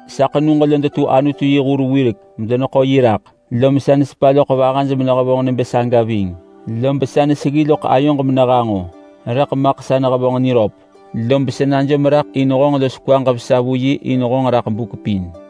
Sa ḳenug lo detu Anutu yi hur wirek medeneḳo yi raḳ, lom sa nesepa loḳ vahaj menehevonġ nebë saga ving, lob sa neseggi loḳ ayoġ menehanġo, rëḳ maḳ sa nehevonġ niröp. Lob sa najom raḳ in honġ los kwaġ vesa vu yi in honġ raḳ buk pin.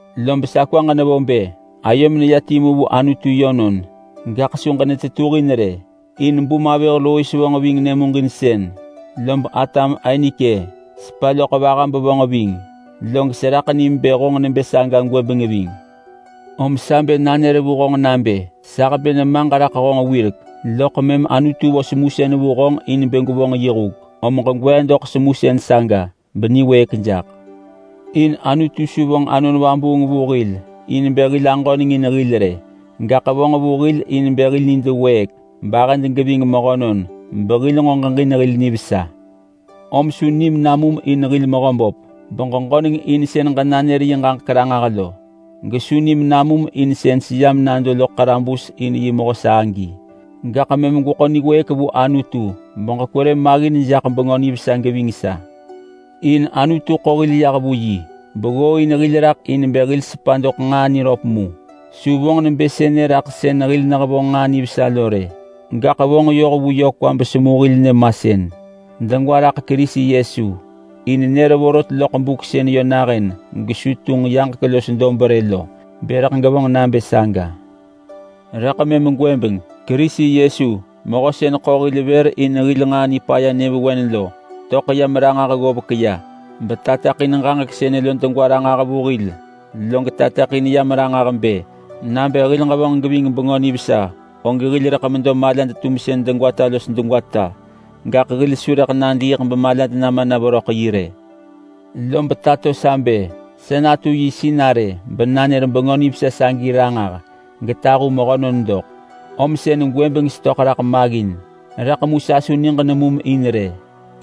Lob sa kwaġ nevo bë ayom neya timu vu Anutu yönon, gaḳ su ġenetetuhin rë. In bum avëh Lois vonġ ving nyëmuġinsën, lob atam Ainike sepa loḳ vaha bevonġ ving, log seraḳ nim bë honġ nebë saga gwëbeng ving. Om sa bë nanër vu honġ nabë: Sa hebë nemaġ raḳ honġ wirek, loḳ mëm Anutu vo semusën vu honġ in bë gwevonġ yi huk. Om ġegwee doḳ semusën saga beniwëëk jaḳ. In Anutu su vonġ Anon Vabuung vu hil in bë hil aġöneng in hil rë, gaḳ vonġ vu hil in bë hil nid wëëk bahëd geving mehönon, behil nġo ġeġin hil nivesa. Om su nim namum in hil Mehöböp beġeġöneng in sën ġenanër yi ġaġek ranġah lo. Gesu nim namum in sën seyam nado loḳ ḳarabus in yi mehö sa agi. Gaḳ mëm gweḳo niwëëk vu Anutu bekwerë maggin jaḳ Bengö Nivesa geving sa. In Anutu ḳo hil yah vu yi beggooin hil raḳ in bë hil sepa doḳ nġaa niröp mu. Su vonġ nebë sënë raḳ sën hil nehevonġ nġaa nivesa lo rë, gaḳ vonġ yoh vu yö kwa besemu hil nyëmasën, degwa raḳ Kerisi Yesu. In nër vorot loḳ buk sën yö nahën gesu tunġ yaġek los dob rë lo bë rëḳ gevonġ nabë saga. Rëḳ mëm gwëbeng Kerisi Yesu, mehö sën ḳo hil vër in hil nġaa nipaya nyëvewen lo, töḳ yam ranġah ggovek ya betateḳin ġaġek sënë lo degwa ranġah vu hil. Log tateḳin yam ranġah bë: Nabë hil ġevonġ geving Bengö Nivesa, og hil rëḳ medo malad-tumsën degwata los degwata, gaḳ hil su rëḳ nadiiḳ bemalad nama na veröḳ yi rë. Lob tato sa bë sa natu yi sinarë benanër Bengö Nivesa sagi ranġah getahu mehönon doḳ, om sën gwëbeng setöḳ raḳ maggin. Rëḳ mu sa su niġ nemum in rë,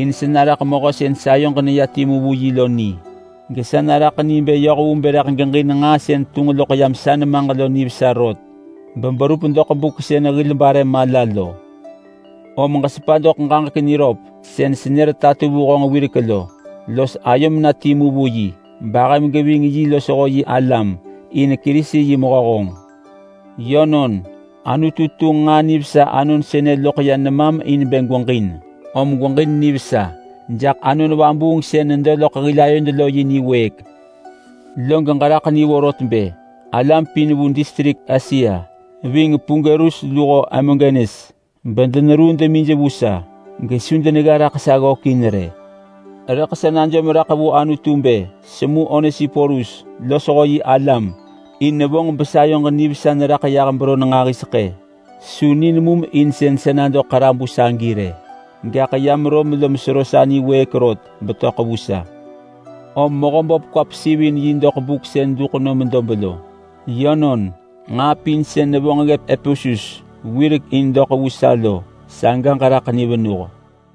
in sa naraḳ mehö sën sayoġ neya timu vu yi lo ni, gesa naraḳ ni bë yoh vu bë rëḳ geġin nġaa sën tunġ loḳ yam sa nemaġ lo nivesa rot, beberup doḳ buk sën hil bare mala lo. Om ġesepa doḳ ġaġek niröp sën senër tato vu honġ wirek lo, los ayom na timu vu yi bahëm geving yi losho yi alam, in Kerisi yi mehö honġ. Yönon, Anutu tunġ nġaa nivesa anon sënë loḳ ya nemam in bë gweġin, om gweġin nivesa jaḳ Anon Vabuung sën nedo loḳ hil ayod lo yi niwëëk. Log ġeraḳ ni vorot bë alam pin vu distrik Asia, ving Pugelus luho Hermogenes, bedeneruu demij vu sa gesu denegga raḳ sa ggökin rë. Rëḳ sa najom raḳ vu Anutu bë semu Onesiporus losho yi alam, in nevonġ besayoġ nivesa neraḳ yah beron nġahiseḳë. Su ni nemum in sën sa nado ḳarabus agi rë, gaḳ yam Rom lom sero sa niwëëk rot betöḳ vu sa. Om Mehöböp kwa pesivin yi doḳ buk sën duḳ nom dob lo. Yönon, nġaa pin sën nevonġ ggëp Epesus wirek in doḳ vu sa lo, saga ġeraḳ ni venuh.